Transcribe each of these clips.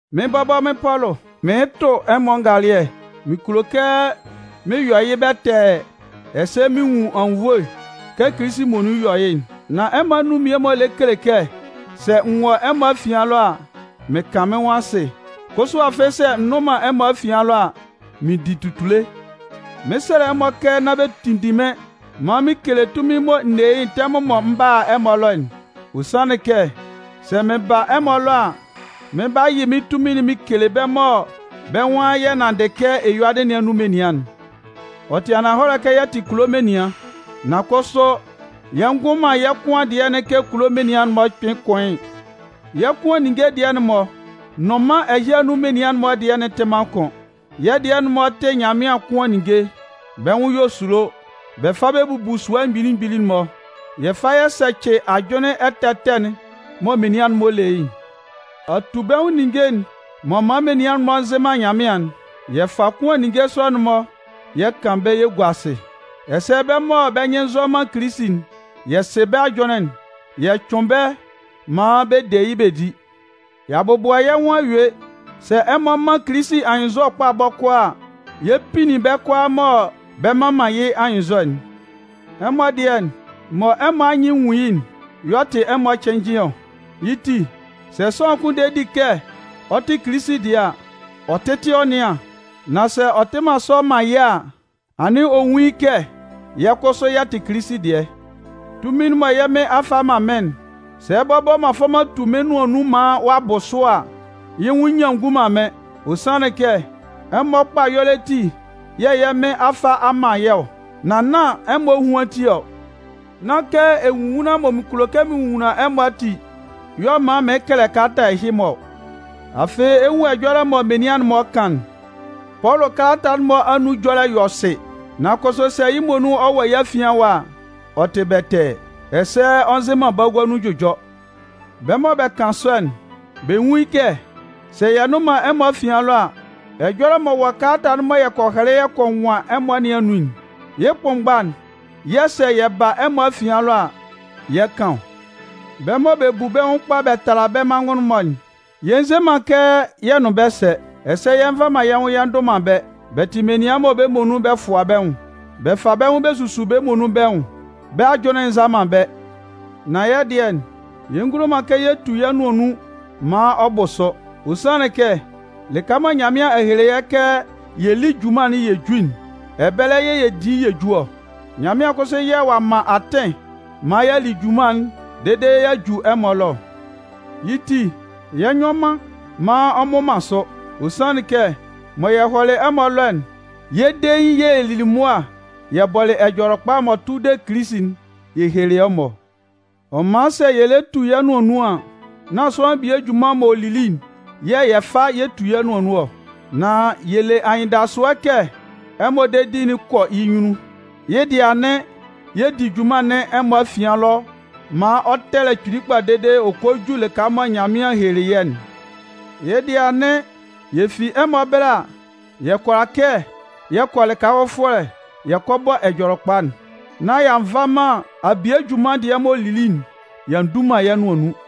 Mɩ́n bɔbɔ mɩ́n Pɔlʋ, mɩɩn tʋ ɛmɔ ngalɩɛ. Mɩn kulo kɛ mɩn yɔ yɩ́ bɛtɛɛ ɛsɛ mɩn nwun anwunnvoe kɛ Kilisi muonun yɔ yɩ́'n. Nan ɛmɔ anun mmie-mɔ lɛ kele kɛ sɛ n wɔ ɛmɔ afian ɛlɔ a, mɩn kan mɩ́n nwʋn asɩ. Kʋsʋ afɩ sɛ n nnʋn man ɛmɔ afian ɛlɔ a, mɩn di tutule. Mɩɩn sɛlɛ ɛmɔ kɛ nán bɛ tinndin mɩ́n maan mɩn kele tunmin'n mɔ n ne yɩ́'n tɛmʋn m'ɔ m 'ba a ɛmɔ ɛlɔ'n. Ɔ sanlɩn kɛ sɛ mɩn ba ɛmɔ ɛlɔ a, mɩn 'ba yɩ mɩ́n tunmin'n mɩn kele bɛ́ mɔ bɛ́ nwan yɛ nanndɩ kɛ eyuadɩ nɩn anun menian'n. Ɔ tɩ ananhɔlɛ kɛ yɛ tɩ kulo menian, nan kʋsʋ yɛ ngʋn man yɛ́ kʋan dɩɛ'n kɛ kulo menian'n-mɔ kpɩn kʋan yɩ́'n. Yɛ́ kʋan ninnge dɩɛ'n-mɔ nʋn mân ɛhɩ anun menian'n-mɔ dɩɛ'n tɩ man kʋn. Yɛ́ dɩɛ'n-mɔ tɩ Nyanmɩan kʋan ninnge. Bɛ́ nwʋn yɔ esulo. Bɛ fa bɛ bubu sua mgbili mgbili'n-mɔ. Yɛ fa yɛ sɛcɩ ajʋnlɩn ɛtɛ ɛtɛ'n mɔ menian'n-mɔ le yɩ́'n. Atubɛnwʋn ninnge m'ɔ man menian'n-mɔ nzɩ man Nyanmɩan'n, yɛ fa kʋan ninnge sɔ'n-mɔ yɛ kan bɛ́ yɛ gua asɩ. Ɛsɛ bɛ́ mɔ bɛ́ nyɩn nzɔ man Kilisi'n, yɛ sɩ bɛ́ ajʋnlɩn'n yɛ cʋɩn bɛ́ maan bɛ de yɩ́ bɛ di. Y'a bɔbʋa yɛ́ nwʋn a yue, sɛ ɛmɔ man Kilisi anyɩnnzɔ kpa bɔkɔɔ a, yɛ 'pinnin bɛ́ kʋalaa mɔ bɛ mman man yɩ́ anyɩnnzɔ'n. Ɛmɔ dɩɛ, mɔ ɛmɔ anyɩn nwun yɩ́'n y'ɔ tɩ ɛmɔ cɩnnjɩn ɔ. Yɩ́ ti, sɛ sʋanlan kʋn de di kɛ ɔ tɩ Kilisi dɩɛ a, ɔ tɩ́tɩ ɔ nɩ́an, nán sɛ ɔ tɩ sɔ man yɩ́ a, anɩn ɔ nwún yɩ́ kɛ yɛ́ kʋsʋ yɛ tɩ Kilisi dɩɛ. Tunmin'n mɔ yɛ́ Mɩn a fa a man mɩ́n'n, sɛ bɔbɔ m'an fa m'an tu mɩ́n nʋan nun maan ɔ'a bʋ sʋ a, yɩ́ nwʋn nyian ngun man mɩ́n. Ɔ sanlɩn kɛ, ɛmɔ kpa ɛyɔlɛ ati yɛ̂ yɛ́ Mɩn a fa a man yɛ́ ɔ, nan nán ɛmɔ ehuan ti ɔ. Nán kɛ enwonwunlan mɔ mɩn kulo kɛ mɩn nwonwunlan ɛmɔ ati y'ɔ man mɩɩn kɛlɛ kalata ɛhɩ-mɔ ɔ. Afɩ, ɛ 'nwun ɛjɔlɛ mɔ menian'n-mɔ kan'n: “Pɔlʋ kalata'n-mɔ anun ɛjɔlɛ'n yɔ sɩ. Nan kʋsʋ sɛ yɩ́ muonun ɔ wɔ yɛ́ afian ɛwa a, ɔ tɩ bɛtɛɛ, ɛsɛ ɔ nzɩ man bagua nun jʋjɔ.” Bɛ́ mɔ bɛ kan sɔ'n, bɛ nwún yɩ́ kɛ sɛ yɛ nnʋn man ɛmɔ afian ɛlɔ a, ɛjɔlɛ m'ɔ wɔ kalata'n mɔ yɛ kɔ hɛlɛ yɛ kɔ nwan ɛmɔ nɩn anun'n, yɩ́ kʋnmgba'n yɛ̂ sɛ yɛ ba ɛmɔ afian ɛlɔ a, yɛ 'kan ɔ. Bɛ́ mɔ bɛ bu bɛ́ nwʋn kpa bɛ tala bɛ́ manngʋn-mɔ'n, yɛ nze man kɛ yɛ nʋn bɛ́ sɛ. Ɛsɛ yɛ nva man yɛ́ nwʋn yɛ ndʋ man bɛ́. Bɛ tɩ menian mɔ bɛ́ muonun bɛ fʋa bɛ́ nwʋn. Bɛ fa bɛ́ nwʋn bɛ susu bɛ́ muonun bɛ́ nwʋn. Bɛ́ ajʋnlɩn'n nza man bɛ́. Nan yɛ́ dɩɛ, yɛ ngulo man kɛ yɛ tu yɛ́ nʋan nun maan ɔ bʋ sʋ. Ɔ sanlɩn kɛ lɩka mɔ Nyanmɩan a hele kɛ yɛ lí junman'n yɛ jú'n, ɛbɛlɛ yɛ̂ yɛ 'di yɛ ju ɔ. Nyanmɩan kʋsʋ yɛ̂ ɔ'a man atɩn maan y'a li junman'n dede y'a ju ɛmɔ ɛlɔ ɔ. Yɩ́ ti, yɛ nyɔ man maan ɔ mmʋ man sʋ. Ɔ sanlɩn kɛ mɔ yɛ hɔlɩ ɛmɔ ɛlɔ'n, yɛ́ dein yɛ̂ yɛ lili mʋa yɛ bɔlɩ Ɛjɔlɛkpa'n m'ɔ tʋ de Kilisi'n yɛ helelɩ ɛmɔ ɔ. Ɔ man sɛ yɛ lɛ tu yɛ́ nʋan nun an, nán sʋanlan bie junman mɔ ɔ'a li'n yɛ̂ yɛ 'fa yɛ 'tu yɛ́ nʋan nun ɔ. Nan yɛ le anyɩndasʋɛ kɛ ɛmɔ dedi'n 'kɔ yɩ́ nyunnun. Yɩ́ dɩɛ anɩn, yɛ di junman nɩn ɛmɔ afian ɛlɔ maan ɔ tɛlɛ kpili kpa dede ɔ kɔ ju lɩka mɔ Nyanmɩan helelɩ yɛ́'n. Yɩ́ dɩɛ anɩn, yɛ fi ɛmɔ ɛbɛlɛ, yɛ kʋala kɛ yɛ kɔ lɩka fʋfɔlɛ yɛ kɔ bɔ Ɛjɔlɛkpa'n. Nan y'a nva man abie junman dɩɛ mɔ ɔ'a li'n y'a ndu man yɛ́ nʋan nun.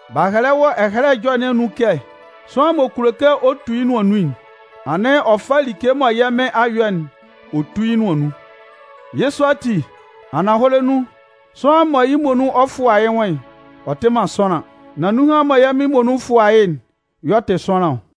B'a hɛlɛ wɔ Ɛhɛlɛ Ɛjɔlɛ nɩn anun kɛ: Sʋanlan m'ɔ kulo kɛ ɔ tu yɩ́ nʋan nun'n, anɩn ɔ fá like mɔ yɛ́ Mɩn a yɔ'n ɔ tú yɩ́ nʋan nun. Yɩ́ sɔ ati, ananhɔlɛ nun, sʋanlan mɔ yɩ́ muonun ɔ fʋa yɩ́ nwʋn'n, ɔ tɩ man sʋanlan. Nan nunhan mɔ yɛ́ Mɩn muonun fʋa yɩ́'n y'ɔ tɩ sʋanlan ɔ.